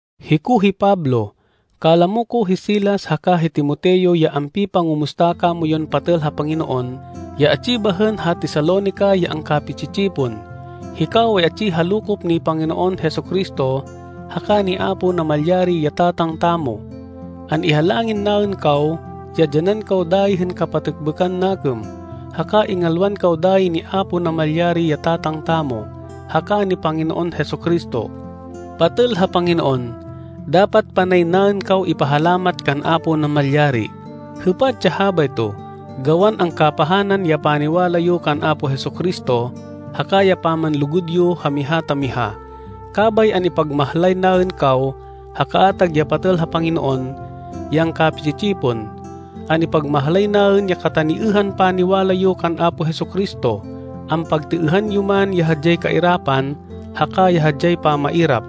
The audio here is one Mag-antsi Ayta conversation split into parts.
Hiko hi Pablo, kalamo ko hi Silas haka hi Timoteo ya ampipangumusta kamoyun patêl ha Panginoon ya atsi bahên ha Tesalonica ya angkapi-tsi-tsipon. Hikaw ay atsi ha lokop ni Panginoon Jesu-Cristo haka ni Apo Namalyari, ya Tatang tamo. An-ihalangin naên kaw ya dyanan kaw dayi hên kapatêkbêkan nakêm, haka ingalwan kaw dayi ni Apo Namalyari ya Tatang tamo, haka ni Panginoon Jesu-Cristo. Patêl ha Panginoon, dapat panay naên kaw ipahalamat kan Apo Namalyari. Hêpat ya habayto, gawan angkapahanan ya paniwala yo kan Apo Jesu-Cristo haka ya pamanlugud yo ha miha ta miha. Kabay an-ipagmahlay naên kaw ha kaatag ya patêl ha Panginoon ya angkapi-tsi-tsipon. An-ipagmahlay naên ya kataniêhan paniwala yo kan Apo Jesu-Cristo, ampagtêêhan yo man ya hadyay kairapan haka ya hadyay pamairap.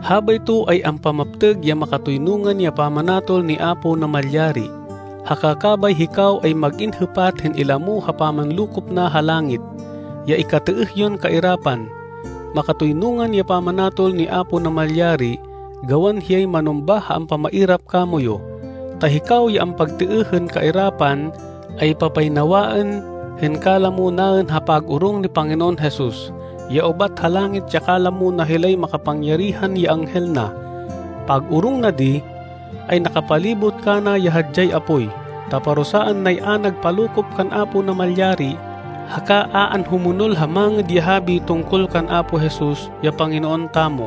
Habayto ay ampamaptêg ya makatoynungan ya pamanatol ni Apo Namalyari, haka kabay hikaw ay mag-in hêpat hên ilamo ha pamanlokop na ha langit, ya ikatêêh yon kairapan. Makatoynungan ya pamanatol ni Apo Namalyari gawan hiyay manumbah ha ampamairap kamoyu. Ta hikaw ya ampagtêêh hên kairapan ay papaynawaên hên kalamo naên ha pag-orong ni Panginoon Jesus ya ubat ha langit ya kalamo na hilay makapangyarihan ya anghel na. Pag-orong na di, ay nakapalibot kana ya hadyay apoy, ta parusaan nay a nagpalokop kan Apo Namalyari haka a anhumonol ha Mangêd ya Habi tungkol kan Apo Jesus, ya Panginoon tamo.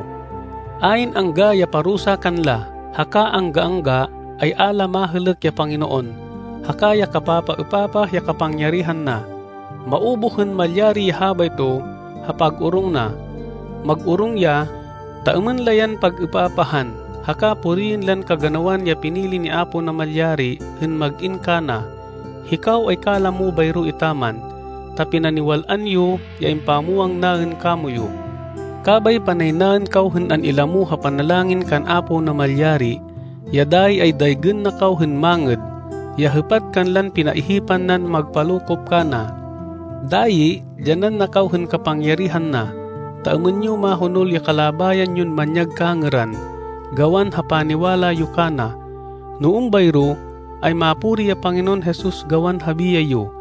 Ayn angga ya parusa kanla, haka angga-angga, ay a la mahêlêk ya Panginoon, haka ya kapapaêpapah ya kapangyarihan na. Maubuh hên malyari ya habayto ha pag-orong na. Mag-orong ya, ta êmên la yan pag-êpapahan, haka puriên lan kaganawan ya pinili ni Apo Namalyari hên mag-in kana. Hikaw ay kalamo bayro etaman, ta pinaniwal-an yo, ya impamwang naên kamoyu. Kabay panay naên kaw hên an-ilamo ha panalangin kan Apo Namalyari, ya dayi ay daygên na kaw hên mangêd, ya hêpat kanlan pinaihipan nan magpalokop kana. Dayi dyanan na kaw hên kapangyarihan na, ta êmên yo mahonol ya kalabayan yon manyag kangêran, gawan ha paniwala yo kana. No êmbayro, ay mapuri ya Panginoon Jesus gawan ha biyay yo,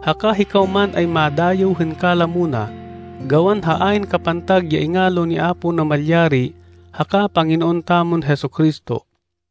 haka hikaw man ay madayêw hên kalamo na, gawan ha ayn kapantag ya ingalo ni Apo Namalyari haka Panginoon tamon Jesu-Cristo.